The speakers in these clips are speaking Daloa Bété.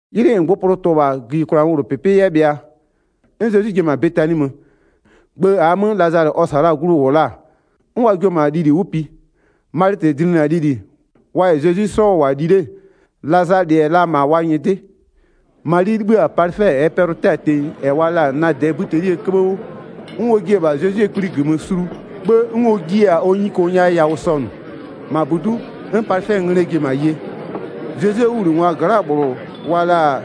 'Ylɩ -ngbʋpʋlʋ tʋ-ʋ -bha gïyikwlaa 'möwlʋpɩpɩ 'yɛ bhɩa, 'n Zezwi ji-e -ma Betani mö, gbë -aa 'mö Lazalɩ -ɔ ɔ -sa la-a glu -wʋ la-a. 'N wa jio-o -ma lili 'wʋ pi. Malɩtɩ dlinɩ-a lili, -wa -yɛ Zezwi 'sɔ -wʋ-a li 'le, Lazalɩ-ɛ la -ma wa nyɩdɩ. Mali 'libhï-a palɩfɛ -ɛɛ pɛlʋ-ʋ 'tɛ-a tenyi -ɛ wa la-a nadɩɛ 'bïtelie 'köbhë 'wʋ, 'n ɔ jie-e -bha Zezwie kpli -gömö sulu, 'bhë 'n ɔ jiɩ-a ɔ nyuko nya yawʋ sɔnʋ. -Ma -budu'u, 'n palɩfɛɛ nglɛ ji-e -ma ye. Zezwie 'wʋbhlinɩngwa gla'aa -bhlʋ wa la-a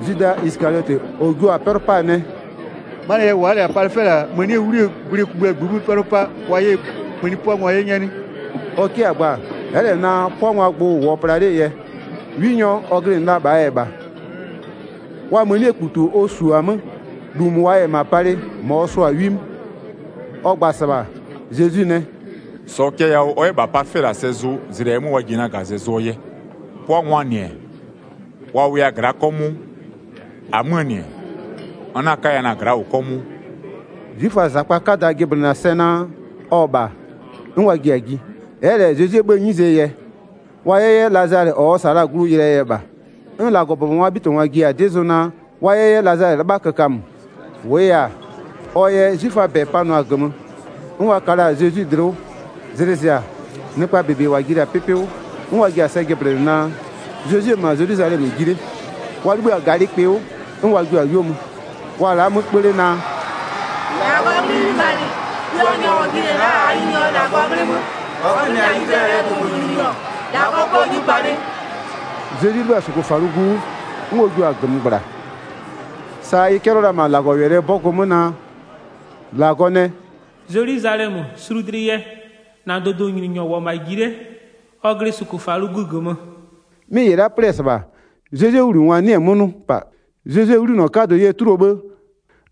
Zwida Isɩkaliɔtɩ -ɔ jio-a 'pɛlʋ 'paa nɛ: “'Manɩɛ yɛ wa'a -lɛ-a palɩfɛ -la mënie 'wlie gwlɩ kugbïa -ngbï 'mö 'pɛlʋ 'pa, wa 'yɛ ɛ mëni 'pʋangwa 'ye 'nyɛ 'nɩ?” Ɔ 'kɩ-a gba, ɛ'ɛ -lɛ naa, 'pʋangwaa gbʋ-ʋ -wʋɔ pla 'lee yɛ, 'winyɔ ɔ glɩnɩ la -bhaa yɛ -bha. Wa mënikputu -ʋ ɔ -su-aa 'mö, -lu -mʋ wa -yɛ -ma palɩ -ma ɔ sʋ-a 'wi 'mö. Ɔ gba-a -sɩbha, Zezwi nɛ: “-Sɔɔ cɛ yawʋ, ɔ 'yɛ -bha palɩfɛ -la sɛ zʋ zlɩ -ɛɛ 'mö wa ji-e na -gazɛ zʋɔ yɛ. 'Pʋangwaa -nɩ-ɛ, wa wʋya gla'a 'kɔmʋʋ, -amöö -nɩ-ɛ, n 'na 'kaya na-a gla'a -wʋ 'kɔmʋʋ.” 'Zwiföaa -zakpa 'kada jɩblɩnɩ-a sɛ naa, ɔ-ɔ -bha, 'n wa ji-a ji. Ɛ'ɛ -lɛ Zezwie 'bhëë 'nyizee yɛ, wa 'yɛ 'yɛ Lazalɩ ɔ -sa la-a glu yɩlɩɛ yɛ -bha. 'N -Lagɔbʋbɔngwaa 'bhitɩbhangwa ji-a 'dɩ zʋ naa wa 'yɛ 'yɛ Lazalɩ 'lɩbha kökamö. 11-Wʋʋ yɛ-a, ɔ yɛ 'zwiföaa -bɛ panʋa-a -gömö, 'n wa ka la-a Zezwi dlɩ 'wʋ. Zlɩ zɩ-a, nɩkpaa -bebe -wa ji la-a 'pɩpɩ 'wʋ 'n wa ji-a sɛ jɩblɩnɩ naa, Zezwi-e -ma Zelwizalɛmö ji 'le. Wa 'libhï-a -galɩkpɩ 'wʋ, 'n wa jio-a 'yuo mö. Wa-a la'a 'mö 'kpö 'le naa: “-Lagɔɔ 'nglɩ 'ghlimanɩ! Puanyɔ -ɔ jinɩ-ɛ la'a -aa Nyininyɔ -Lagɔɔ 'nglɩ 'mö, -ɔ glɩnɩ-a Izlayɛlɩɛ dʋdʋnyininyɔ, -Lagɔ 'pɔ 'nyupalɩ!” Zezwi 'libhï-a -sʋkʋfalʋgu 'wʋ, 'n ɔ jiʋ-a -gömö -gbla, sa ɩ 'cɛlɩɔ la-a -ma -Lagɔwɛlɩɛ 'bɔgʋ 'mö naa, -Lagɔ nɛ: “Zelwizalɛmö, sulu dlɩ yɛ, -na dʋdʋnyininyɔ -wʋ-ɔ -ma ji 'le, ɔ glɩ -sʋkʋfalʋgu -gömö.” 'Mɩ -ɩ la'a 'plɩ-ɛ -sɩbha, Zezwie 'wʋbhlinɩngwa 'nɩɩ-ɩ 'mö 'nʋ -pa. Zezwie 'ghlinɔ 'kadʋ yɛ 'tuluo 'bhë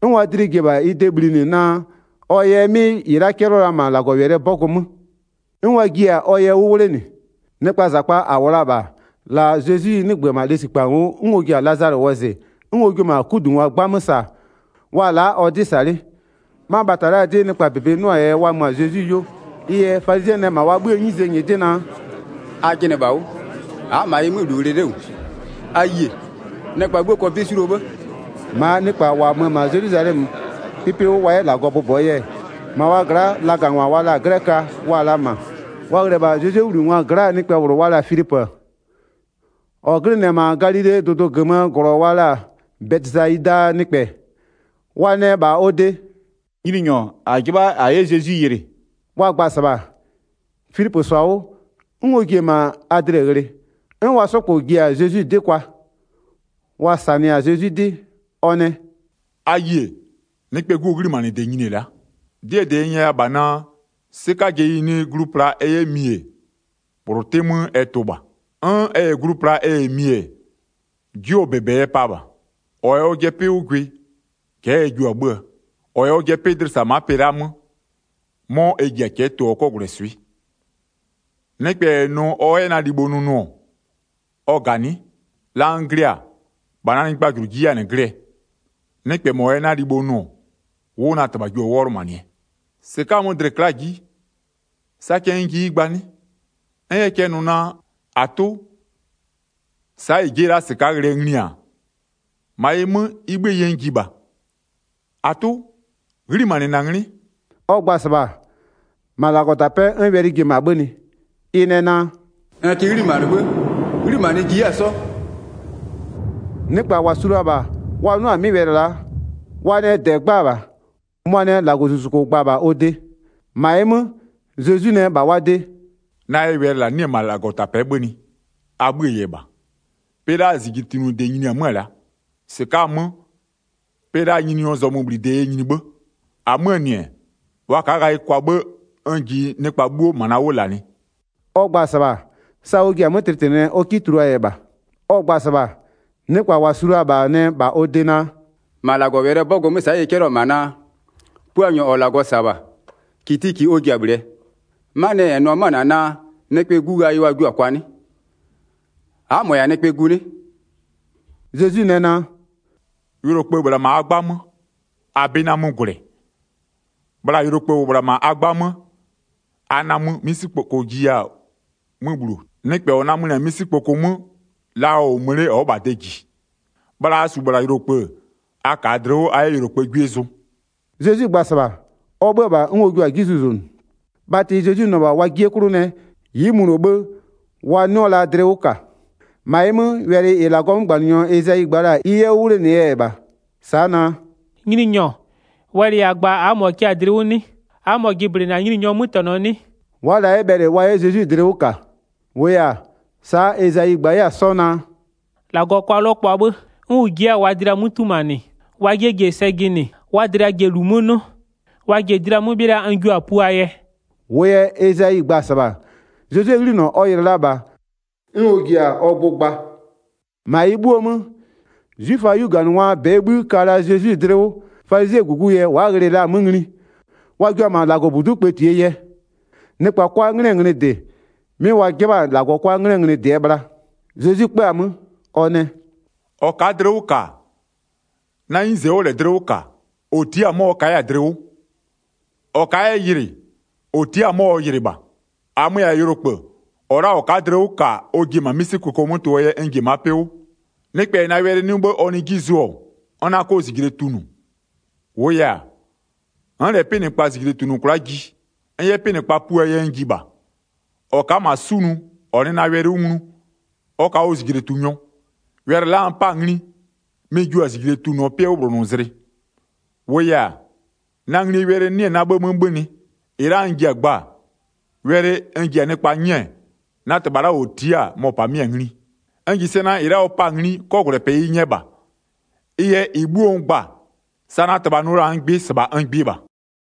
'n wa dlɩ ji-e -bha bhlinɩ naa ɔ yɛ 'mɩ -ɩ la'a 'cɛlɩɔ la-a -ma -Lagɔwɛlɩɛ 'bɔgʋ 'mö, 'n wa jiɩ-a ɔ yɛ 'wʋ 'wlenɩ. Nɩkpaa -zakpa -a -wʋ la-a -bha, la Zezwi 'nɩgbö-ö -bha lesikpa ngo'o 'n ɔ ji-a Lazalɩ wɔzɩ, 'n ɔ jio-o -ma 'kudungwa 'gbamö -sa, wa-a la'a ɔ 'dɩ -sa 'le. 'Ma bhata la'aa 'dɩ nɩkpaa -bebe 'nʋ la-aa yɛ wa mö-a Zezwi 'yuo. Ɩ yɛ falizɩɛ nɛ -ma wa 'bhïë 'nyizee nyɩdɩ naa: “A jɩnɩ -bha 'wʋ, a'a -ma ɩ 'mö -lu ghlɩ 'le -wʋ, a yie, nɩkpa 'bhuo kɔ 'bɩ 'suluo 'bhë.” 'Glɛköa 'jɩbha wa 'yɛ Zezwi yɩlɩ 20-Maa nɩkpa -wa mö-ö -ma Zelwizalɛmö 'pɩpɩ 'wʋ wa 'yɛ -Lagɔ bʋbɔɔ yɛ, -ma wa gla'a lagangwa wa la-a 'glɛköa wa-a la -ma. Wa ghlɩ-ɛ -bha Zezwie 'wʋbhlinɩngwa gla'aa nɩkpɛ -bhlʋ wa la-a Filipö, -ɔ glɩnɩ-ɛ -ma Galilee dʋdʋ -gömöö -glɔ wa la-a Bɛtɩsayidaa nɩkpɛ, wa nɛ -bha ɔ de: “Nyininyɔ, -a 'jɩbha -a 'yɛ Zezwi yɩlɩ.” Wa gba-a -sɩbha, Filipö -sɔ-a 'wʋ 'n ɔ ji-e -ma Adle ghlɩ, 'n wa 'sɔ -kpɔ ji-a Zezwi 'dɩ kwa. Wa -sanɩ-a Zezwi 'dɩ, ɔ nɛ: “A yie, Nɩkpɛɛ 'Guo 'ghlimanɩde nyini-e la'a. 'Dɩɛ -dɩ n nyɛya -bha naa: 'Sɩkajeyi nɩ -ma glu pla ɛ 'yɛ mi-e, -bhlʋ 'tɩ 'mö ɛ tʋ -bha. 'N ɛ -yɛ glu pla ɛ -yɛ mi-e, 'jʋɔ -bebe ɛ pa -bha. 25-Ɔ -yɛ ɔjɩɛ 'pɩ 'wʋ gwɩ, cɛ'ɛ ɛ jio-a 'bhö-ö, -ɔ -yɛ ɔjɩɛ 'pɩ dlɩ -sa ma'a pɩ la'aa 'mö, 'mɔ ɛ ji-a cɛ'ɛ tʋɔ 'kɔgwlɛswɩ'ɩ. Nɩkpɛ -yɛ nʋ ɔ 'yɛ na libho nʋ nʋ-ɔ, ɔ -ganɩ'ɩ, la n glɩ-a, -bha na nyɩgbajʋlʋ ji 'yɛ-a -nɩ glɩɛ. Nɩkpɛ -mɔ -yɛ na libho nʋ-ɔ, 'wʋ na -Tɩbha jio-a 'wɔlʋmanɩɛ. Zezwi yɛ ɔ tlɩtlɩgbʋ gba 27-Sɩka'a-a 'mö, dlɩ-ɩ kla'a-a 'ji, sa cɛ n 'yɛ yɩ gba 'nɩ? N 'yɛ cɛ nʋ naa: -Atʋ, sa'a -ɩ ji'i-e -la -sɩka'a ghlɩɛ ngli-a? -Ma ɩ 'mö, ɩ 'bhïë yɛ n ji -bha. 28-Atʋ, 'ghlimanɩ -na 'nglɩ.” Ɔ gba-a -sɩbha, -ma -Lagɔtapɛ'ɛ 'n wɛlɩ ji-e -ma 'bhönɩ. Ɩ nɛ naa: “N kɩ 'ghlimanɩ 'bhë, 'ghlimanɩɛ n jiɩ 'yɛ-a 'sɔ.” Nɩkpa -wa su la-a -bha -wa 'nʋ-a 'mɩ wɛlɩ, wa nɛ -dɛ 'gba-a -bha, -mʋmʋa nɛ -Lagɔzuzuko gba-a -bha ɔ de. 30-Ma ɩ 'mö, Zezwi nɛ -bha wa de: “Na yɛ wɛlɩ -la 'nɩ-ɛ -ma -Lagɔtapɛ'ɛ 'bhönɩ, a 'bhïë yɛ -bha. Pɩ la'aa -zijletunʋde nyini-e 'mö-ö la'a, -sɩka'a-a 'mö, pɩ la'aa nyininyɔɔ zɔmöbhlide yɛ nyini 'bhë. 32-Amö-ö -nɩ-ɛ, wa ka'a ghayɩ kwa 'bhë, n ji nɩkpa 'bhuo -ma na 'wʋ -lanɩ.” Ɔ gba-a -sɩbha-a, sa ɔ ji-a 'mö tlɩtlɩnɩɛ, ɔ 'kɩ tuluaa yɛ -bha. Ɔ gba-a -sɩbha, nɩkpa -wa su la-a -bha nɛ -bha ɔ de naa: “-Ma -Lagɔwɛlɩɛ 'bɔgʋ 'mö sa'a wa 'cɛlɩ-ɛ -ma naa: Puanyɔ -ɔ -Lagɔ -sa-a -bha, -kitiki ɔ ji-a -bhlɩɛ. 'Manɩɛ yɛ -n nʋ-ɔ 'mö-ö -na naa: Nɩkpɛɛ 'Gu, ghayɩ wa jio-a kwa 'nɩ? A'a -mɔɔ bhë -yɛ-a Nɩkpɛɛ Gu 'nɩ?” Zezwi nɛ naa: “Yʋlokpë-ë -bhla -ma a 'gbamö, a 'bɩ 'na 'mö gwlɛ, bhla yʋlokpë -wʋ -bhla -ma a 'gbamö, a namö 'misikpoko jiya-a 'mö bhuluo. Nɩkpɛ -ɔ namönɩ-a 'misikpoko 'mö, la ɔ -wʋ mö 'le ɔ'ɔ -bha de -ji. Bhla a -su -bhla yʋlokpë-ë, a -kaa dlɩ 'wʋ a 'yɛ yʋlokpëë 'gwie zʋ.” Zezwi gba-a -sɩbha, ɔ 'bhö-ö -bha 'n ɔ jua-a 'ji zuzonʋ. Bhatɩ Zezwi nʋ-ɔ -bha wa 'jie 'klʋ nɛ, ɩ'ɩ mʋno 'bhë wa 'nɩɔ la dlɩ 'wʋ -ka. 38-Ma ɩ 'mö, wɛlɩ -ɩ -Lagɔɔ 'mögbanɩnyɔ Ezayi gba la-a, ɩ 'yɛ 'wʋ 'wlenɩɛ yɛ -bha. Sa'a naa: “Nyininyɔ, wɛlɩ -a gba-a, a'a -mɔ kɩ-a dlɩ 'wʋ 'nɩ? A'a -mɔ jɩblɩnɩ-a Nyininyɔɔ 'mötɛnɔ 'nɩ?” Wa'a la 'yɛ bhɛlɩ wa 'yɛ Zezwi dlɩ 'wʋ -ka, -wʋʋ yɛ-a, sa'a Ezayi gba 'yɛ-a 'sɔ naa: “-Lagɔ kʋa 'lɔkpʋa 'bhë, 'n ʋ ji 'yɛ-a wa dlɩa 'mö 'tumanɩ, wa 'jie ji-e sɛ jɩnɩ, wa dlɩa ji-e -lu 'mö 'nʋ, Wa ji-e dlɩa 'mö 'bhɩla n jua-a puaa yɛ.” 41-Wʋʋ yɛ Ezayi gba-a -sɩbha, Zezwie 'ghlinɔ ɔ yɩlɩ la -bha, 'n ɔ ji-a ɔ gbʋ gba. 42-Ma ɩ 'bhuoo 'mö, 'zwiföaa 'yuganɩngwaa -bɛɛ bhï-ï ka la-a Zezwi dlɩ 'wʋ, falizɩɛɛ -gugu yɛ wa'a ghlɩ-ɩɩ la-a 'mö ngli, wa jua-a -ma -Lagɔbudu'u kpëtie yɛ. Nɩkpa 'kwa 'nglɩɛ nglɩ -dɩ, 'mɩ wa 'jɩbha-a -Lagɔ 'kwa 'nglɩɛ nglɩ -dɩɛ bhla. Zezwi 'kpö-a 'mö, ɔ nɛ: “-Ɔ ka'a dlɩ 'wʋ -ka, na 'nyize ɔ'ɔ -lɛ dlɩ 'wʋ -ka, -ɔ tia'a-a 'mɔ ɔ ka 'yɛ-a dlɩ 'wʋ. 45-Ɔ ka'a 'yɛ yɩlɩ, -ɔ tia'a-a 'mɔ ɔ yɩlɩ -bha. 46-Amö-ö -yɛ-a yʋlokpë, -ɔ la'a -ɔ ka'a dlɩ 'wʋ -ka, ɔ ji-e -ma 'misikpoko 'mö tʋ-ʋɔ yɛ n ji-e ma'a 'pɩ 'wʋ. Nɩkpɛ -yɛ na wɛlɩ 'nʋ 'bhë ɔ nɩɩ 'ji zʋ-ɔ, n 'na 'kɔ -zijle tunʋ. -Wʋʋ yɛ-a, n'n -lɛ 'pɩnɩkpa -zijle -tunʋ kwla'a ji, n 'yɛ 'pɩnɩkpa puaa yɛ n ji -bha. 48-Ɔ ka'a -ma 'sunʋ, -ɔ nɩ na wɛlɩ 'wʋ nglu, ɔ ka ɔ -zijletunʋnyɔ. Wɛlɩ la'a n 'pa-a ngli, mɩ-ɩ jio-a -zijle tunʋɔ 'pɩɛ 'wʋbhlonʋzlɩ. 49-Wʋʋ yɛ-a, na nglie wɛlɩ 'nɩ-ɛ -ma na 'bhë 'mö 'bhönɩ. -Ɩ la'a n ji-a gbaa, wɛlɩ -ɩ n ji-a nɩkpa 'nyɛɛ, na -Tɩbha la'a -ɔ tia'a-a, mɔ-ɔ -pamɩ'ɩ-a ngli. N -ji sɛ naa -ɩ la'a ɔ pa'a-a ngli, 'kɔgwlɛpɩ ɩ nyɛ -bha. Ɩ yɛ -ɩ 'bhuo n gba-a, sa na -Tɩbha nʋ la-a n gbɩ, -sɩbha n gbɩ -bha.”